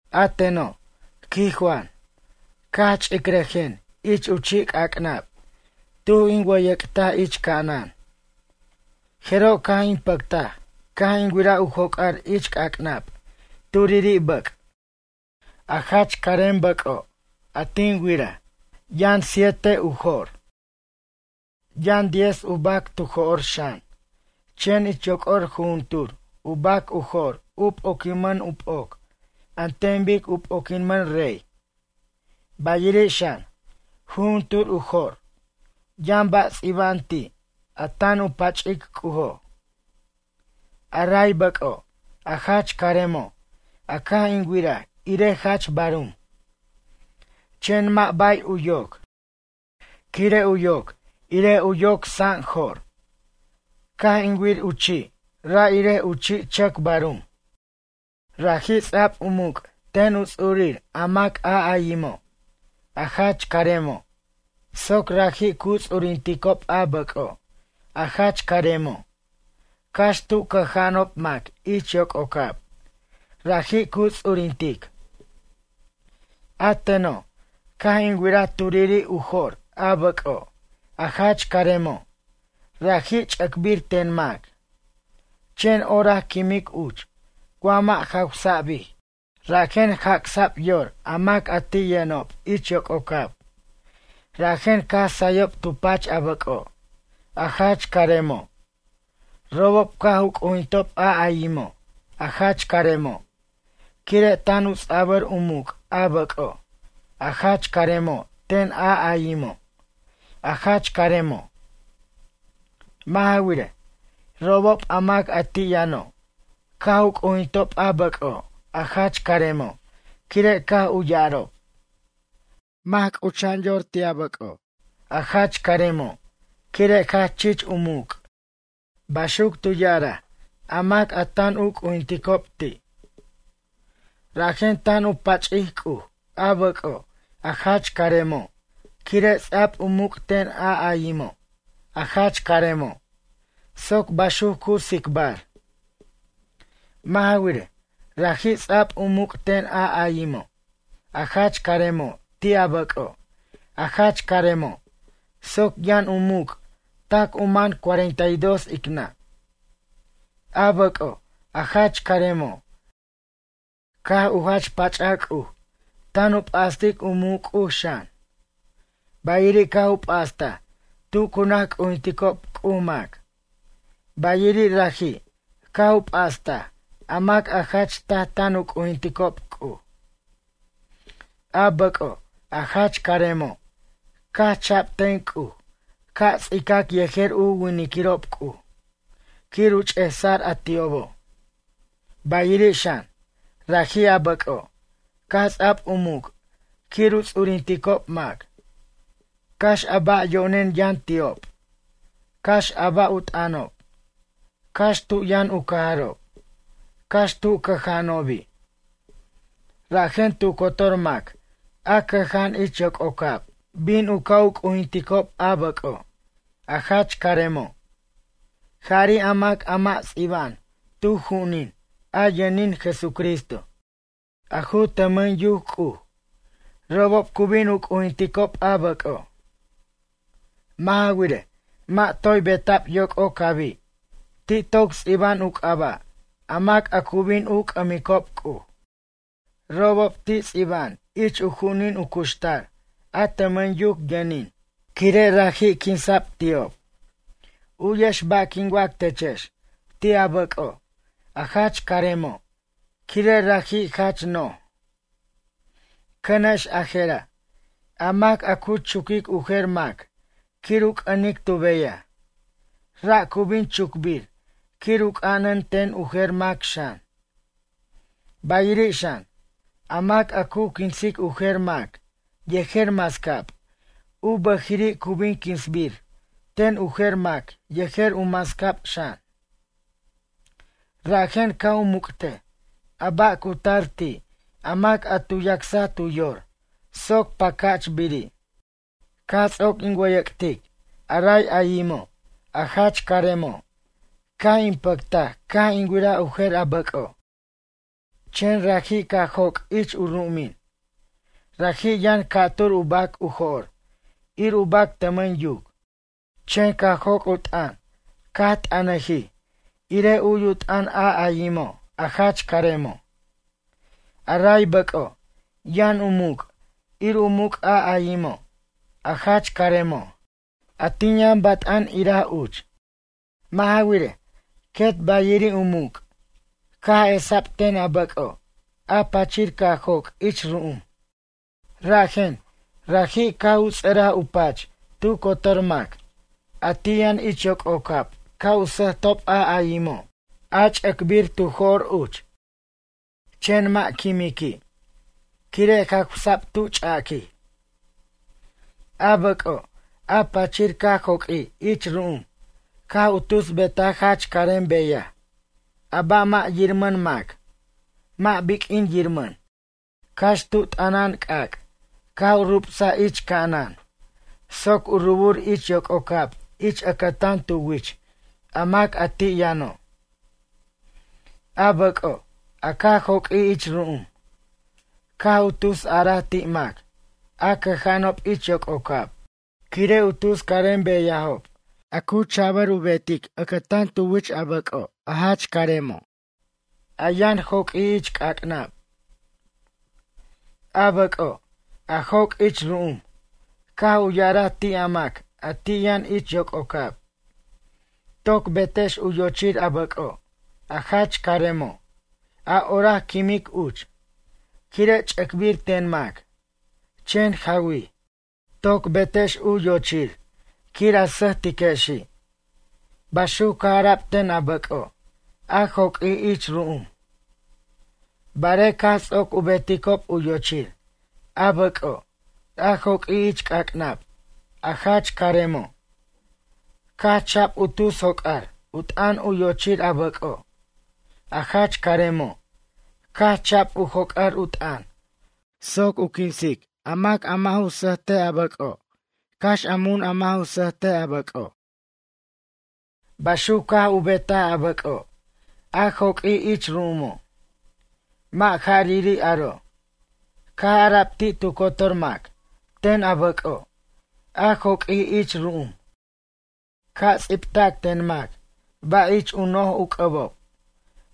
A teno', quij Juan, caj ch'icrajen ich u chi' c'ac'nab tuj in wʌyʌc'taj ich ca'anan. Jeroj, caj in pʌctaj caj in wiraj u joc'ar ich c'ac'nab turiri' bʌc'. A jach carem bʌc'o' a tin wiraj, yʌn siete u jo'r. Yʌn diez u bac tu jo'r xan, chen ich yoc'or jujuntur u bac u jo'r u p'oquimʌn u p'oc an ten bic u p'oquimʌn rey. Bayiri' xan, jujuntur u jo'r yʌn ba' ts'iba'an ti' a tan u pach'ic C'ujo'. A ray bʌc'o', a jach caremo', a caj in wiraj irej jach barum, chen mʌ' bay u yoc, quire' u yoc irej u yoc sa'njo'r. Caj in wir u chi' ra' irej u chi' chʌc barum. Raji' ts'a'b u muc' ten u ts'urir a mac a ayimo', a jach caremo', soc raji' cu ts'urinticob a bʌc'o' a jach caremo' cax tu cʌja'anob mac ich yoc'ocab raji' cu ts'urintic. A teno', caj in wiraj turiri' u jo'r a bʌc'o', a jach caremo', raji' ch'ʌcbir ten mac, chen orac quimic uch wa mʌ' jawsa'bij. Rajen jac'sa'b yor a mac a ti' yʌnob ich yoc'ocab, rajen caj sayob tu pach a bʌc'o', a jach caremo'. Robob caj u c'ujintob a ayimo', a jach caremo', quire' tan u ts'abʌr u muc' a bʌc'o', a jach caremo' ten a ayimo', a jach caremo'. Mʌ' ja wirej, robob a mac ti' yʌno' caj u c'ujintob a bʌc'o', a jach caremo', quire' caj u ya'arob: ―Mac c'ucha'an yor ti' a bʌc'o', a jach caremo' quire' jach chich u muc' ―baxuc tu ya'araj a mac a tan u c'ujinticob ti'. Rajen tan u pach'ic C'uj, a bʌc'o', a jach caremo', quire' ts'a'b u muc' ten a ayimo', a jach caremo' soc baxuc cu tsicbar. Mʌ' ja wirej, raji' ts'a'b u muc' ten a ayimo', a jach caremo' ti' a bʌc'o', a jach caremo' soc yʌn u muc' tac u man cuarenta y dos ic nʌ'. A bʌc'o', a jach caremo', caj u jach pach'aj C'uj tan u p'astic u muc' C'uj xan. Bayiri' caj u p'astaj tu cu naj c'ujinticob C'uj mac, bayiri' raji' caj u p'astaj a mac a jach taj tan u c'ujinticob C'uj. A bʌc'o', a jach caremo', caj cha'b ten C'uj ca' ts'icac yejer u winiquirob C'uj quir u ch'esa'r a ti'obo'. Bayiri' xan, raji', a bʌc'o' caj ts'a'b u muc' quir u ts'urinticob mac, cax a ba' yo'nen yʌn ti'ob, cax a ba' u t'ʌnob, cax tu yʌn u cajarob, cax tu cʌja'anobi'. Rajen tu cotor mac a cʌja'an ich yoc'ocab bin u ca' u c'ujinticob a bʌc'o', a jach caremo'. Jari' a mac a mʌ' ts'iba'an tu ju'unin a yʌnin Jesucristo, a ju tʌmʌn yuc C'uj, robob cu bin u c'ujinticob a bʌc'o'. Mʌ' ja wirej mʌ' toy beta'b yoc'ocabi', ti' toc ts'iba'an u c'aba' a mac a cu bin u c'ʌmicob C'uj. Robob ti' ts'iba'an ich u ju'unin u cuxtar a tʌmʌn yuc yʌnin, quire' raji' quinsa'b ti'ob. U'yex ba' quin wac techex ti' a bʌc'o', a jach caremo', quire' raji' jach no'j. Cʌnex a je'ra', a mac a cu chuquic u jer mac quir u c'ʌnic tu beyaj, ra' cu bin chucbir quir u c'anan ten u jer mac xan. Bayiri' xan, a mac a cu quinsic u jer mac yejer mascab u bʌjiri' cu bin quinsbir ten u jer mac yejer u mascab xan. Rajen ca' u muc'tej a ba' cu tar ti' a mac a tu yacsaj tu yor soc pacachbiri'. Caj ts'oc in wʌyʌc'tic a raj ayimo', a jach caremo', caj in pʌctaj caj in wiraj u jer a bʌc'o'. Chen raji' caj joc' ich u ru'umin, raji' yʌn ca'tur u bac u jo'r ir u bac tʌmʌn yuc. Chen caj joc' u t'ʌn caj t'anajij irej u'yu t'ʌn a ayimo', a jach caremo'. A ray bʌc'o', yʌn u muc' ir u muc' a ayimo', a jach caremo', a tin yʌn bat'an iraj uch. Mʌ' ja wirej, quet bayiri' u muc' caj esa'b ten a bʌc'o', a pachir caj joc' ich ru'um. Rajen, raji' caj u ts'ʌraj u pach tu cotor mac a ti' yʌn ich yoc'ocab ca' u sʌjtob a ayimo', a ch'ʌcbir tu jo'r uch, chen mʌ' quimiqui', quire' jawsa'b tu ch'aquij. A bʌc'o', a pachir caj joq'uij ich ru'um caj u tus betaj jach carem beyaj a ba' mʌ' yirmʌn mac mʌ' biq'uin yirmʌn, cax tu t'ʌnan c'ac' caj u rubsaj ich ca'anan soc u rubur ich yoc'ocab ich ʌcʌtan tu wich a mac ti' yʌno'. A bʌc'o', a caj joq'uij ich ru'um, caj u tus ara ti' mac a cʌja'anob ich yoc'ocab quire' u tus carem beyajob a ju cha'bʌr u betic ʌcʌtan tu wich a bʌc'o' a jach caremo', a yʌn joq'uij ich c'ac'nab. A bʌc'o', a joc' ich ru'um caj u ya'araj ti' a mac a ti' yʌn ich yoc'ocab: “Toc betex u yochir a bʌc'o', a jach caremo', a orac quimic uch, quire' ch'ʌcbir ten mac, chen jawij. Toc betex u yochir quir a sʌjtiquexi'.” Baxuc caj ara'b ten a bʌc'o' a joq'uij ich ru'um. Barej caj ts'oc u beticob u yochir a bʌc'o' a joq'uij ich c'ac'nab a jach caremo', caj cha'b u tus joc'ar u t'ʌn u yochir a bʌc'o', a jach caremo' caj cha'b u joc'ar u t'ʌn soc u quinsic a mac a mʌ' ju sʌjt a bʌc'o', cax a mun a mʌ' ju sʌjt a bʌc'o'. Baxuc caj betaj a bʌc'o', a joq'uij ich ru'umo'. Mʌ' ja'riri' aro', caj ara'b ti' tu cotor mac ten a bʌc'o', a joq'uij ich ru'um, ca' ts'ibtac ten mac ba' ich u noj u c'ʌbo'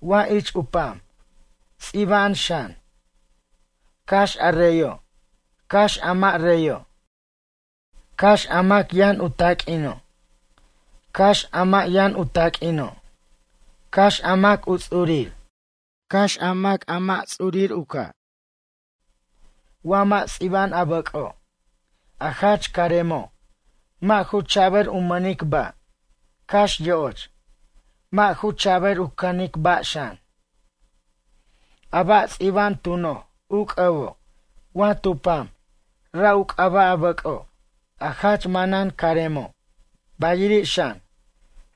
wa ich u pam, ts'iba'an xan. Cax a reyo' cax a mʌ' reyo', cax a mac yʌn u taq'uino', cax a mʌ' yʌn u taq'uino', cax a mac u ts'urir, cax a mac a mʌ' ts'urir u ca'. Wa mʌ' ts'iba'an a bʌc'o', a jach caremo', mʌ' ju cha'bʌr u mʌnic ba', cax yo'och, mʌ' ju cha'bʌr u canic ba' xan. A ba' ts'iba'an tu noj u c'ʌbo' wa tu pam ra' u c'aba' a bʌc'o' a jach manan caremo' bayiri' xan,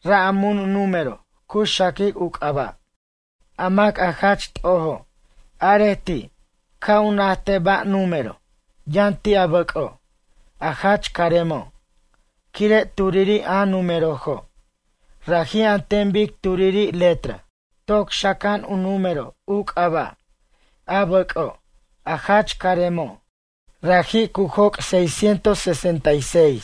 ra' a mun número cu xaquic u c'aba'. A mac a jach t'ojo', arej ti' ca' u najtej ba' número' yʌn ti' a bʌc'o', a jach caremo'. Quire' turiri' a númerojo' raji' an ten bic turiri' letra. Toc xaca'an u número u c'aba', a bʌc'o', a jach caremo', raji' cu joc' seiscientos sesenta y seis.